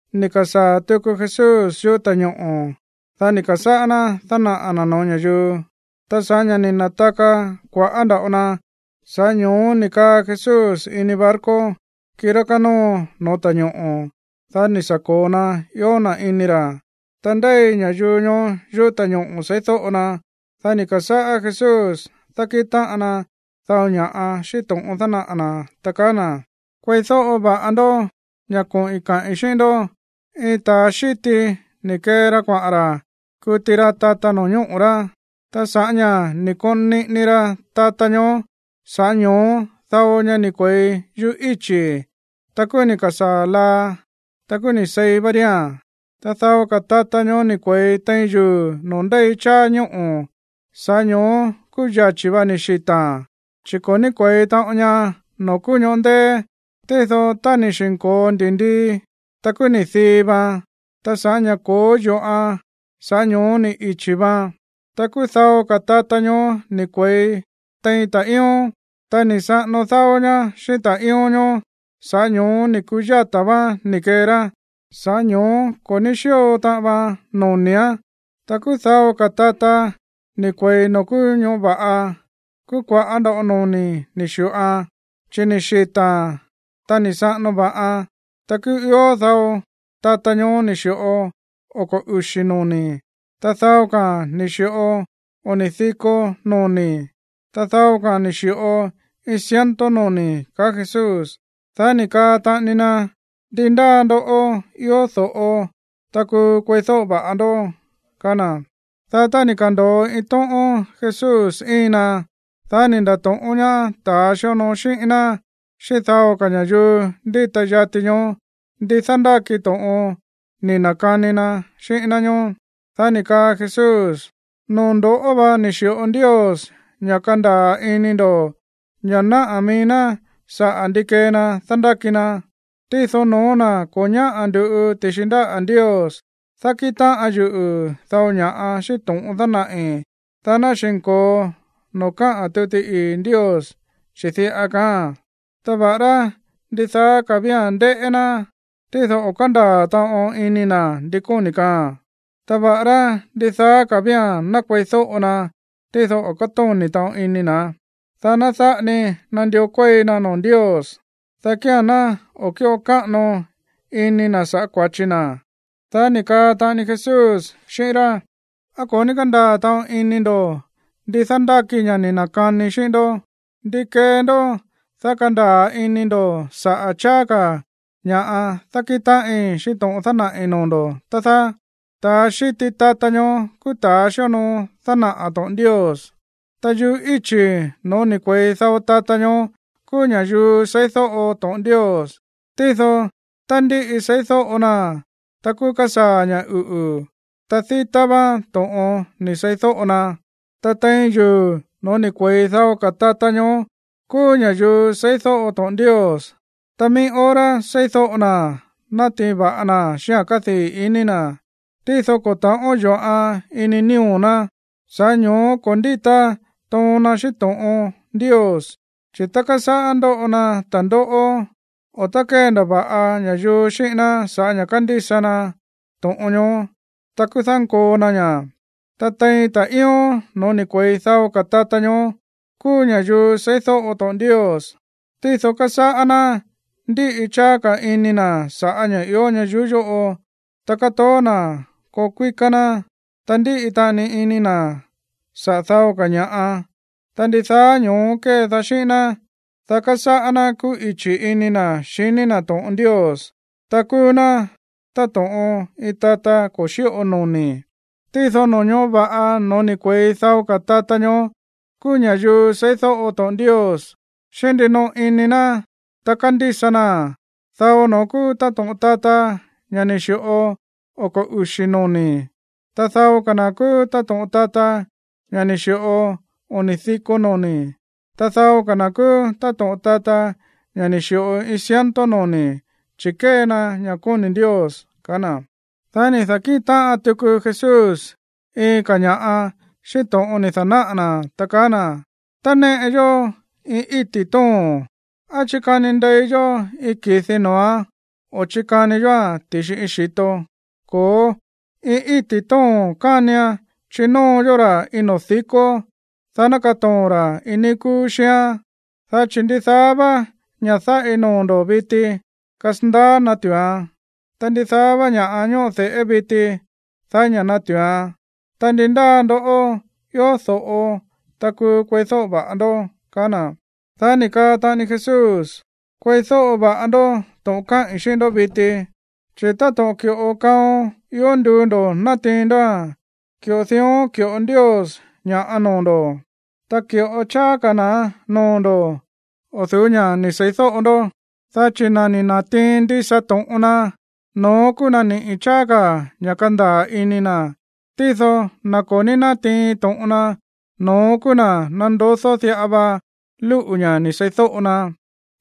Ni̱ ka̱sáa̱ tuku Jesús yuꞌú ta̱ñoꞌo̱, dá ni̱ ka̱sáꞌá ná dánaꞌa̱ na̱ no̱ó ña̱yuu. Ta sa̱ꞌá ña̱ ni̱ na̱taka kua̱ꞌá nda̱ꞌo na, sa̱ꞌá ño̱ó ni̱ kaa Jesús ini barco, kirá kánóo no̱ó ta̱ñoꞌo̱. Dá ni̱ sa̱ ko̱o na ió na̱ ini ra̱. Ta ndéi ña̱yuu ñoó yuꞌú ta̱ñoꞌo̱ seídóꞌo na. Dá ni̱ ka̱sáꞌá Jesús dákíꞌin táꞌan na dao ña̱ꞌa xíꞌín to̱ꞌon dánaꞌa̱ na̱, ta kaá na̱: ―Kueídóꞌo va̱ꞌa ndó ña̱ koꞌi̱n kaꞌi̱n xíꞌín ndó. Iin ta̱a xíti ni̱ kee ra kuaꞌa̱n ra̱ kuti ra tata no̱ñóꞌo̱ rá. Ta sa̱ꞌá ña̱ ni̱ koon niꞌini ra tata ñoó, sa̱ꞌá ño̱ó dao ña ni̱ kue̱i yuꞌú íchi̱. Ta kúú ni̱ ka̱sáa̱ laa, ta kúú ni̱ seí vá ría̱n. Ta dao ka̱ tata ñoó ni̱ kue̱i tein yuu̱ noo̱ ndéi cháá ñóꞌo̱. Sa̱ꞌá ño̱ó kúú yachi̱ va ni̱ xita̱a̱n, chi̱ ko̱ ní kuéi taꞌon ña noo̱ kúú ñoꞌó ndéé. Tído, tá ni̱ xi̱nko̱o ndi̱ndii, ta kúú ni̱ dii vaan. Ta sa̱ꞌá ña̱ ko̱ó yo̱ꞌan, sa̱ꞌá ño̱ó ni̱ ichi̱ vaan. ’Ta kúú dao ka̱ tata ñoó ni̱ kue̱i tein ta̱ꞌíón. Ta ni̱ saꞌano dáó ñá xíꞌín ta̱ꞌíón ñoó, sa̱ꞌá ñoó ni̱ ku̱yatá váán ni̱ kee rá. Sa̱ꞌá ño̱ó ko̱ ní xi̱ꞌo taꞌan vaan noni̱án. ’Ta kúú dao ka̱ tata ni̱ kue̱i noo̱ kúú ñoꞌó va̱ꞌa. Kúú kua̱ꞌá nda̱ꞌo noni̱ ni̱ xi̱ꞌoan, chi̱ ni̱ xita̱a̱n, ta ni̱ saꞌano va̱ꞌan. Ta kúú ió dao tata ñoó ni̱ xi̱ꞌo oko̱ uxi̱ noni̱. Ta dao ka̱a̱n ni̱ xi̱ꞌo oni̱ diko noni̱. Ta dao ka̱a̱n ni̱ xi̱ꞌo iin ciento noni̱ ―kaá Jesús. Dá ni̱ kaa taꞌani na: ―¡Ndi ndáa ndoꞌó ió do̱ꞌo, ta kúú kueídóꞌo va̱ꞌa ndó! ―kaá na̱. Dá tá ni̱ ka̱ndo̱o iin tóꞌón Jesús íin ná, dá ni̱ nda̱to̱ꞌón ñaá ta̱ xíonoo xíꞌín ná xíꞌín dao ka̱ ña̱yuu ndíta yati ñoó ndi dándáki to̱ꞌon ni̱ na̱kani na xíꞌín ná ñóó. Dá ni̱ kaa Jesús: ―Noo̱ ndo̱ꞌó vá ni̱ xi̱ꞌo Ndios ña̱ kandaa̱ ini ndo̱ ña̱ náꞌá mií ná sa̱ꞌá ndi kée na dándáki na. Tído no̱ó na̱ ko̱ ñáꞌa̱ ndu̱ꞌu ti̱xi ndáꞌa̱ Ndios, dákíꞌin táꞌan yuꞌu̱ dao ña̱ꞌa xíꞌín to̱ꞌon dánaꞌi̱, dá ná xi̱nko̱o noo̱ káꞌa̱n tuti ii̱ Ndios, chi̱ diꞌa kaáa̱n: “Ta va̱ꞌará ndidaá ka̱ vía̱n ndéꞌé ná, tído o̱ kándaa̱ taꞌon ini na̱ ndi kóni̱ kaaa̱n. Ta va̱ꞌará ndidaá ka̱ vía̱n ná kueídóꞌo na, tído o̱ kátóni̱ taꞌon ini na̱, dá ná dáꞌa ni nandió kuéi na noo̱ Ndios, dá kía̱n ná o̱ kíꞌo káꞌano ini na̱ saꞌa̱ kua̱chi na.” Dá ni̱ kaa taꞌani Jesús xíꞌín rá: ―¿Á ko̱ ní kándaa̱ taꞌon ini ndo̱ ndi dándáki ña̱ ni̱ na̱kanii xíꞌín ndó? ¿Ndi kee ndó, dá kandaa̱ ini ndo̱ saꞌa̱ cháá ka̱ ña̱ꞌa dákíꞌin táꞌin xíꞌín to̱ꞌon dánaꞌi̱ noo̱ ndo̱, tá dáá? ’Ta̱a xíti tata ñoó kúú ta̱a xíonoo dánaꞌa̱ to̱ꞌon Ndios. Ta yuꞌú íchi̱ noo̱ ni̱ kue̱i dao tata ñoó kúú ña̱yuu seídóꞌo to̱ꞌon Ndios. Tído tá ndíꞌi seídóꞌo naa̱n, ta kúú kásaa̱ ña̱ uꞌu̱, ta dítá váán to̱ꞌon ni̱ seídóꞌo na. Ta tein yuu̱ noo̱ ni̱ kue̱i dao ka̱ tata ñoó kúú ña̱yuu seídóꞌo to̱ꞌon Ndios, ta mií hora seídóꞌo naa̱n, nátiin va̱ꞌa naa̱n xíꞌa̱n kádii̱ iní na̱. Tído ko̱ ta̱ꞌón yo̱ꞌan ini nío̱ ná, sa̱ꞌá ño̱ó ko̱ ndíta toon na xíꞌín to̱ꞌon Ndios. Chi̱ tá kásáꞌá ndoꞌo na ta̱ndóꞌó, o tá kéndava̱ꞌa ña̱yuu xíꞌín ná sa̱ꞌá ña̱ kándísa na to̱ꞌon ñoó, ta kúú dánkoo na ña̱. Ta tein ta̱ꞌíón noo̱ ni̱ kue̱i dao ka̱ tata ñoó kúú ña̱yuu seídóꞌo to̱ꞌon Ndios, tído kásáꞌá ná ndíꞌi cháá ka̱ ini na̱ sa̱ꞌá ña̱ ió ñayuú yóꞌo, ta kátoó na̱ koo kuíká ná. Ta ndíꞌi taꞌani ini na̱ sa̱ꞌá dao ka̱ ña̱ꞌa. Ta ndidaá ñóó kedaá xíꞌín ná, dá kásáꞌá ná kuꞌichi̱ ini na̱ xiní na̱ to̱ꞌon Ndios, ta kúú ná táto̱ꞌon iin tata ko̱ xíꞌo noni̱. ’Tído no̱ñóꞌo̱ va̱ꞌa noo̱ ni̱ kue̱i dao ka̱ tata ñoó kúú ña̱yuu seídóꞌo to̱ꞌon Ndios xíꞌín ndinoꞌo ini na̱, ta kándísa naa̱n. Dao no̱ón kúú táto̱ꞌon tata, ña̱ ni̱ xi̱ꞌo oko̱ uxi̱ noni̱. Ta dao ka̱ na̱ kúú táto̱ꞌon tata, ña̱ ni̱ xi̱ꞌo oni̱ diko noni̱. Ta dao ka̱ na̱ kúú táto̱ꞌon tata, ña̱ ni̱ xi̱ꞌo iin ciento noni̱, chi̱ kée na ña̱ kóni̱ Ndios ―kaá na̱. Dá ni̱ da̱kíꞌin táꞌan tuku Jesús iin ka̱ ña̱ꞌa xíꞌín to̱ꞌon ni̱ da̱náꞌa̱ na̱, ta kaá na̱: ―Tá néꞌe yó iin íti̱ tóo̱n, ¿á chikani ndei yó iin ki̱di noo̱án o chikani yóa̱n ti̱xi iin xi̱to? Ko̱ó, iin íti̱ tóo̱n kánian chinóo yó ra̱ iin noo̱ dikó, dá ná katoo̱n ra̱ iin níí kúú xíán. Dá chi̱ ndidaá vá ña̱ dáꞌi noo̱ ndo̱ viti, kasandaá natu̱uan. Ta ndidaá vá ña̱ꞌa ñóꞌo de̱ꞌé viti, daí ña̱ natu̱uan. Ta ndi ndáa ndoꞌó ió do̱ꞌo, ta kúú kueídóꞌo va̱ꞌa ndó ―ka̱á na̱. Dá ni̱ kaa taꞌani Jesús: ―Kueídóꞌo va̱ꞌa ndó to̱ꞌon káꞌi̱n xíꞌín ndó viti, chi̱ táto̱ꞌon ki̱ꞌo kaon ió nduu ndo̱ natiin ndóa̱n, ki̱ꞌo dión ki̱ꞌo Ndios ña̱ noo̱ ndo̱, ta ki̱ꞌo cháá ka̱ na̱án noo̱ ndo̱ o̱ du̱ú ña̱ ni̱ seídóꞌo ndó, dá chi̱ na̱ ni̱ na̱tiin ndisa to̱ꞌon na, no̱ón kúú na̱ niꞌi̱ cháá ka̱ ña̱ kandaa̱ ini na̱. Tído na̱ ko̱ ní nátiin to̱ꞌon na, no̱ón kúú na̱ nandodó diꞌa va lúꞌu̱ ña̱ ni̱ seídóꞌo na.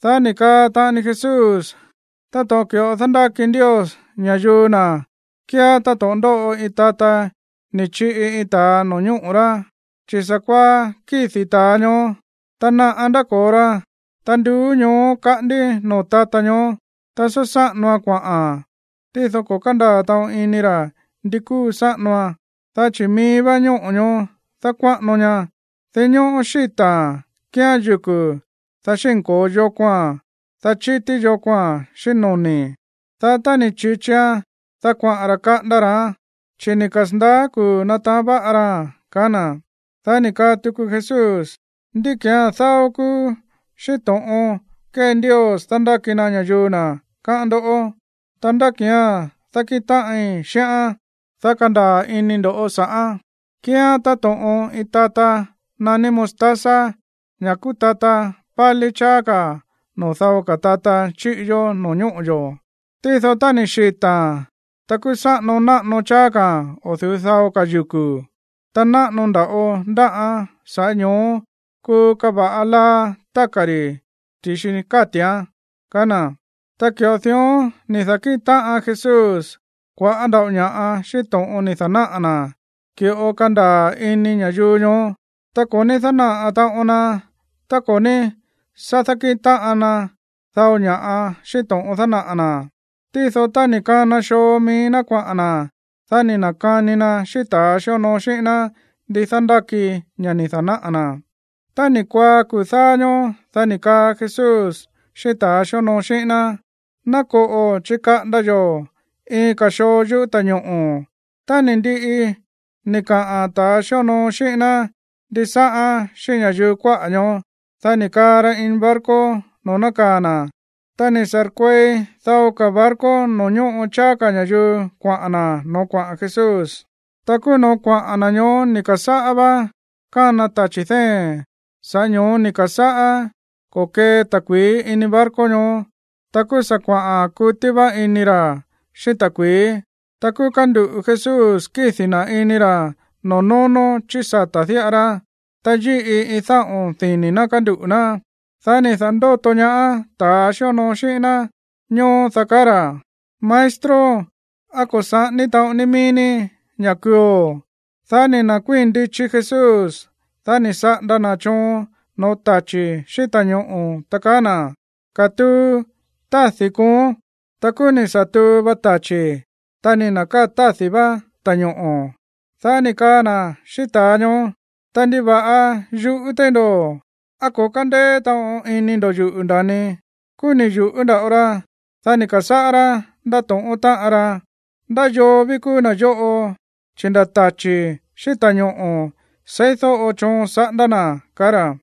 Dá ni̱ kaa taꞌani Jesús: ―Táto̱ꞌon ki̱ꞌo dándáki Ndios ña̱yuu na̱ kíán táto̱ꞌon ndóꞌo iin tata ni̱ chiꞌi iin ta̱a no̱ñóꞌo̱ rá, chi̱ sa̱kuaá kídi̱ ta̱a ñoó, ta naꞌa ndáko̱o ra. Ta nduú ñoó kaꞌándí noo̱ tata ñoó, ta sá sáꞌanoan kuaꞌa̱n. Tído ko̱ kándaa̱ taꞌon ini ra̱ ndi kuu sáꞌanoan. Dá chi̱ mií vá ñóꞌo̱ ñoó dákuáꞌano ña. Dinñóꞌó xíta̱a̱n kíán yuku̱, dá xínko̱o yokoa̱n, dá chítí yokoa̱n xíꞌín noni̱. Dá tá ni̱ chi̱chian, dá kuaꞌa̱n ra̱ kaꞌanda ra̱án, chi̱ ni̱ kasa̱ndaá kuu̱ nataán váꞌa raa̱n ―kaá na̱. Dá ni̱ kaa tuku Jesús: ―¿Ndí ki̱án dáó kúú xíꞌín to̱ꞌon kée Ndios dándáki na ña̱yuu na̱, káꞌán ndó? Ta, ¿ndá ki̱án dákíꞌin táꞌin xíꞌán, dá kandaa̱ ini ndo̱ sa̱ꞌán? Kíán táto̱ꞌon iin tata naní mostaza, ña̱ kúú tata pálí cháá ka̱ noo̱ dao ka̱ tata chíꞌi yó no̱ñóꞌo̱ yo̱. Tído tá ni̱ xita̱a̱n, ta kúú sáꞌano náꞌano cháá ka̱a̱n o̱ du̱ú dao ka̱ yuku̱. Ta náꞌano nda̱ꞌo ndáꞌán, sa̱ꞌá ño̱ó kúu káva̱ꞌa laa táka̱ ri̱ ti̱xi káti̱án ―kaá na̱. Ta ki̱ꞌo dión ni̱ da̱kíꞌin táꞌan Jesús kua̱ꞌá nda̱ꞌo ña̱ꞌa xíꞌín to̱ꞌon ni̱ da̱náꞌa̱ na̱, ki̱ꞌo kándaa̱ ini ña̱yuu ñoó. Ta ko̱ ní dánaꞌa̱ taꞌon na tá ko̱ ní sá dákíꞌin táꞌan na dao ña̱ꞌa xíꞌín to̱ꞌon dánaꞌa̱ na̱. Tído tá ni̱ kana xoo mií ná kuaꞌa̱n na̱, dá ni̱ na̱kani na xíꞌín ta̱ xíonoo xíꞌín ná ndi dándáki ña̱ ni̱ da̱náꞌa̱ na̱. Tá ni̱ kuaá kuu̱ dáá ñóó, dá ni̱ kaa Jesús xíꞌín ta̱ xíonoo xíꞌín ná: ―Ná koꞌo̱ chikaꞌanda yo̱ iin ka̱ xoo yuꞌú ta̱ñoꞌo̱. Tá ni̱ ndiꞌi ni̱ kaꞌa̱n ta̱a xíonoo xíꞌín ná ndisáꞌán xíꞌín ña̱yuu kuáꞌa̱ ñoó, dá ni̱ kaa ra ini barco noo̱ nákaa̱ na̱. Ta ni̱ sa̱rkuei dao ka̱ barco noo̱ ñóꞌo cháá ka̱ ña̱yuu kuaꞌa̱n na̱ noo̱ kuaꞌa̱n Jesús. Ta kúú noo̱ kuaꞌa̱n na̱ ñoó ni̱ ka̱sáꞌá vá kána tachi̱ dée̱n. Sa̱ꞌá ño̱ó ni̱ ka̱sáꞌá ko̱kee ta̱kui̱í ini barco ñoó. Ta kúú sa̱ kuaꞌa̱n kutí vá ini ra̱ xíꞌín ta̱kui̱í. Ta kúú kánduꞌu̱ Jesús kídi̱ na̱ ini ra̱ noo̱ nónó chí sata̱ diꞌa ra. Ta yíꞌi iin dáꞌo̱n dini̱ ná kánduꞌu̱ ná. Dá ni̱ da̱ndóto ñaá ta̱ xíonoo xíꞌín ná ñóó, dá kaá ra̱: ―¡Maestro! ¿Á ko̱ saꞌání taꞌon ni mií ní ña̱ kuuo̱? Dá ni̱ nda̱kuíi̱n ndichi Jesús. Dá ni̱ saꞌanda na̱ choon no̱ó tachi̱ xíꞌín ta̱ñoꞌo̱, ta kaá na̱: ―¡Katuu! Tádi̱ kooón. Ta kúú ni̱ sa̱ tuu va tachi̱, ta ni̱ na̱káa̱ tádi̱ vá ta̱ñoꞌo̱. Dá ni̱ kaa na̱ xíꞌín ta̱a ñoó: ―Ta, ¿ndiva̱ꞌa yuꞌú téí ndo̱? ¿Á ko̱ kándéé taꞌon iní ndo̱ yuꞌu̱, nda̱ni? Kúú ni̱ yu̱ꞌú nda̱ꞌo ra. Dá ni̱ ka̱sáꞌá rá ndátóꞌón táꞌan rá: ―¿Ndá yoo ví kúú na̱ yóꞌo, chi̱ nda̱ tachi̱ xíꞌín ta̱ñoꞌo̱ seídóꞌo choon saꞌanda na̱? ―kaá ra̱.